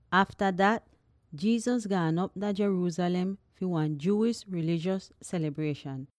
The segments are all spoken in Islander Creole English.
Afta dat, Jesus gaan op dah Jerusalem fi wan Jewish rilijos selibrieshan.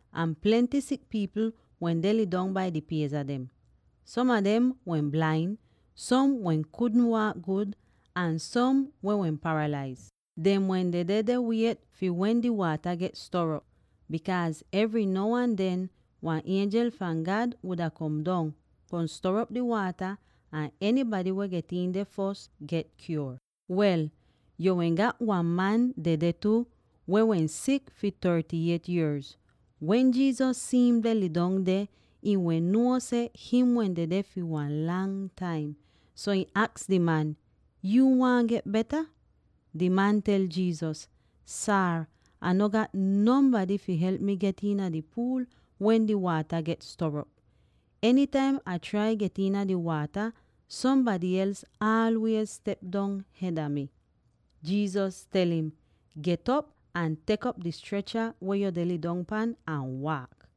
Ahn plenty sik pipl wende lidong bai di pieza dem; som a dem wehn blain, som weh kudn waak gud, ahn som weh wehn paralaiz. [Dem wehn dedeh deh wiet fi wen di waata get stor'op, bikaaz evry now ahn den wan ienjel fahn God wuda kom dong, kom stor'op di waata, ahn enybady weh get iin deh fos get kyuor.] Wel, yo wehn gat wan man weh wehn dedeh tu, weh wehn sik fi thirty-eight yierz. Wen Jesus si'im deh lidong deh, ihn wehn nuo seh him wehn dedeh fi wan lang taim, so ihn aks di man, “Yuu waahn get beta?” Di man tel Jesus, “Saar, Ah no gat nonbady fi help mi fi get iina di puul wen di waata get stor'op. Enytaim Ah trai get iina di waata, sombady els aalwiez step dong hed a mi.” Jesus tel im, “Get'op ahn tek op di strecha weh yo deh lidong pan ahn waak!”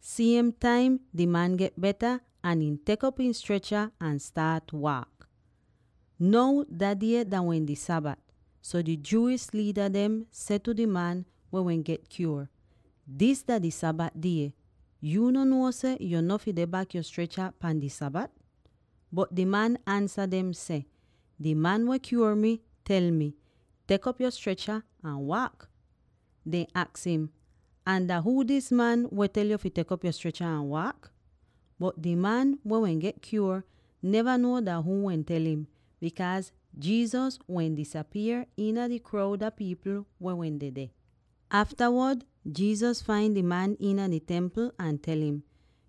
Siem taim di man get beta, ahn ihn tek op ihn strecha ahn staat waak! Now dah die dah wehn di Sabat, so di Jewish liida dehn seh tu di man weh wehn get kyuor, “Dis dah di Sabat die! Yuu no nuo seh yo no fi deh bak yo strecha pahn di Sabat?” Bot di man ansa dem seh, “Di man weh kyuor mi tel mi, ‘Tek op yo strecha ahn waak!’” Dehn aks im, “Ahn dah huu dis man weh tel yo fi tek op yo strecha ahn waak?” Bot di man weh wehn get kyuor neva nuo dah huu wehn tel im, bikaaz Jesus wehn disapier iina di kroud a pipl weh wehn dedeh. Aftawod Jesus fain di man iina di Templ ahn tel im,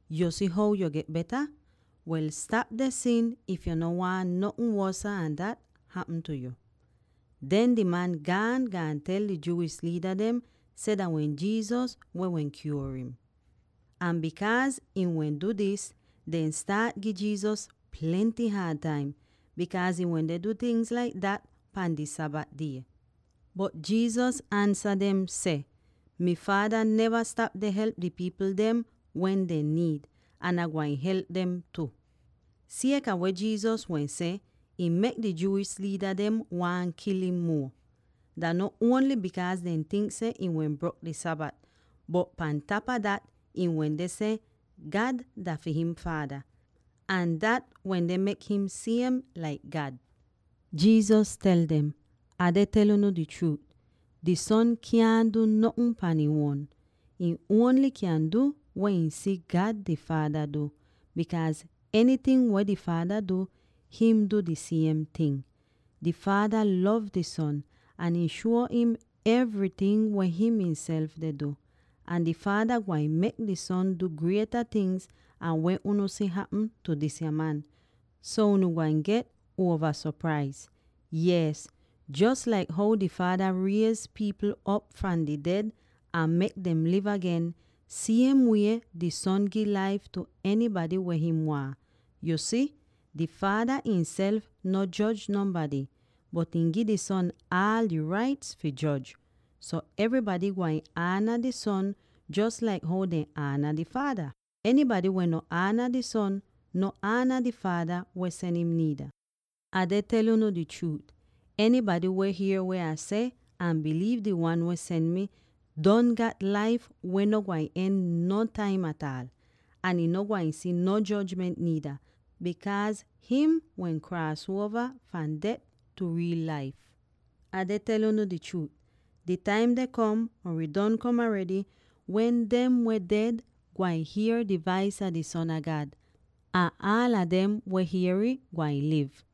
“Yu si how yo get beta? Wel, stap deh sin if yu no waahn notn wosa an dat hapm tu yo.” Den di man gaan, gaan tel di Jewish liida dem seh dah wehn Jesus weh wehn kyuor im. Ahn bikaaz ihn wehn du dis, dehn staat gi Jesus plenty haad taim, bikaaz ihn wende du tingz laik dat pahn di Sabat die. Bot Jesus ansa dem seh, “Mi Faada neva stap deh help di pipl dem wen dehn niid, ahn Ai gwain help dem tu.” Sieka weh Jesus wehn seh, ih mek di Jewish liida dem waahn kil im muo. Dah no ongl bikaaz dehn tink seh ihn wen brok di Sabat, bot pan tapa dat, ihn wende seh God dah fi him faada, ahn dat wende mek him siem laik God. Jesus tel dem, “Ah deh tel unu di chruut: di Son kyaahn du notn pan ihn uon. Ihn ongl kyan du weh ihn si God di Faada du, bikaaz enyting weh di Faada du, him du di siem ting. Di Faada lov di Son, ahn ihn shuo im evryting weh him ihnself deh du; ahn di Faada gwain mek di Son du grieta tingz an weh unu si hapm tu disya man, so unu gwain get uova sopraiz. Yees, jos laik how di Faada riez pipl op fahn di ded ahn mek dem liv agen, siem wie di Son gi laif tu enybady weh him waahn. Yu si, di Faada ihnself no joj nonbady, bot ihn gi di Son aal di raits fi joj, so evrybady gwain ana di Son jos laik how dehn ana di Faada. Enybady weh no ana di Son, no ana di Faada weh sen im niida. Ah deh tel unu di chruut: enybady weh hier weh Ah seh ahn biliiv di Wan weh sen mi, don gat laif weh no gwain don nontaim ataal, ahn ihn no gwain si no jojment niida, bikaaz him wehn kraas uova fahn det tu riil laif. “Ah deh tel unu di chruut: di taim deh kom —or ih don kom aredy— wen dem weh ded gwain hier di vais a di Son a God; ahn aala dem weh hier'ih, gwain liv.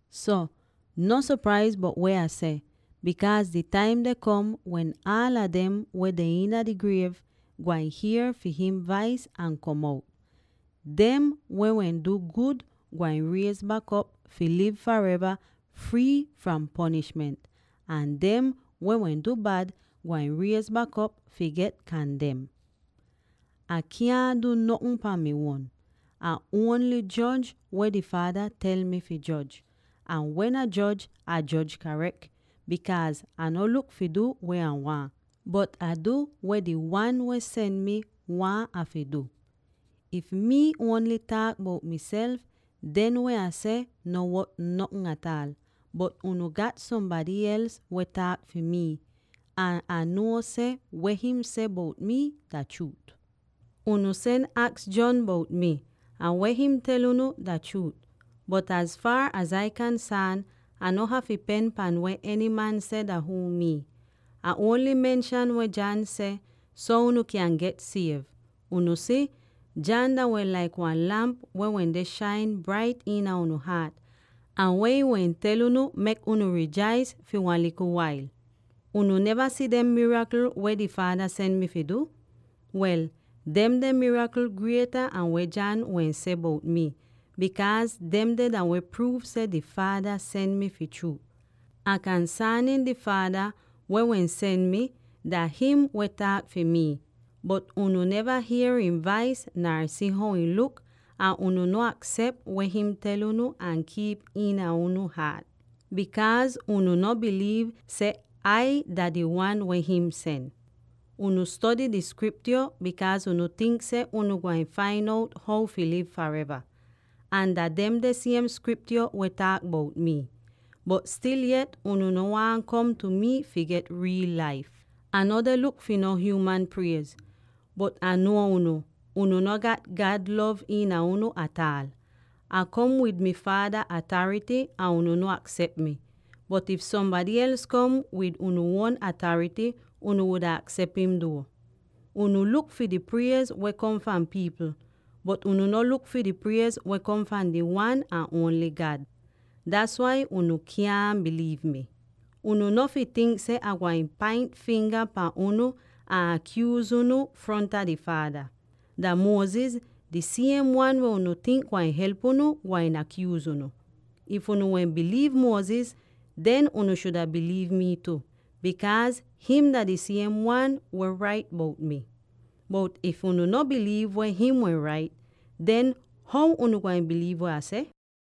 “So, no sopraiz bout weh Ah seh, bikaaz di taim deh kom wen aala dem weh iina dehn griev gwain hier fi him vais ahn kom out. Dem weh wehn du gud gwain riez bak op fi liv fareva frii fahn ponishment; ahn dem weh wehn du bad, gwain riez bak op fi get kandem. “Ah kyaahn du notn pahn mi uon. Ah ongl joj weh di Faada tel mi fi joj; ahn wen Ah joj, Ah joj rait, bikaaz Ah no luk fi du weh Ah waahn, bot Ah du weh di Wan weh sen mi waahn Ah fi du. “If mii ongl taak bout miself, den weh Ah seh no wot notn ataal. Bot unu gat sombady els weh taak fi mii, ahn Ah nuo seh weh him seh bout mi dah chruut. “Unu sen aks John bout mi, ahn weh him tel unu dah chruut. Bot az faar az Ai kansaan, Ah no hafy dipen pahn weh eny man seh dah huu mii. Ah ongl menshan weh John seh, so unu kyan get siev. Unu si, John dah wehn laik wan lamp weh wende shain brait iina unu haat, ahn weh ihn wehn tel unu, mek unu rijais fi wan likl wail. “Unu neva si dem mirakl weh di Faada sen mi fi du? Wel, demde mirakl grieta an weh John wehn seh bout mi, bikaaz demde dah weh pruuv seh di Faada sen mi fi chruut. “Ahn kansaanin di Faada, weh wehn sen mi, dah him weh taak fi mii. Bot unu neva hier ihn vais nar si how ihn luk, ahn unu no aksep weh him tel unu ahn kiip'ih iina unu haat, bikaaz unu no biliiv seh Ai dah di Wan weh him sen. “Unu stody di Skriptyo bikaaz unu tink seh unu gwain fain out how fi liv fareva; ahn dah demde siem Skriptyo weh taak bout mii. Bot stil yet unu no waahn kom tu mi fi get riil laif. “Ah no deh luk fi no hyuuman priez. Bot Ah nuo unu: unu no gat God lov iina unu ataal. Ah kom wid mi Faada atarity, ahn unu no aksep mi. Bot if sombady els kom wid ihn uon atarity, unu wuda aksep im duo. Unu luk fi di priez weh kom fahn pipl, bot unu no luk fi di priez weh kom fahn di Wan ahn ongl God. Das wai unu kyaahn biliiv mi! “Unu no fi tink seh Ah gwain paint finga pahn unu ahn akyuuz unu fronta di Faada; dah Moses —di siem wan weh unu tink gwain help unu— gwain akyuuz unu. If unu wehn biliiv Moses, den unu shuda biliiv mii tu, bikaaz him dah di siem wan weh wehn rait bout mii. Bot if unu no biliiv weh him wehn rait, den how unu gwain biliiv weh Ah seh?”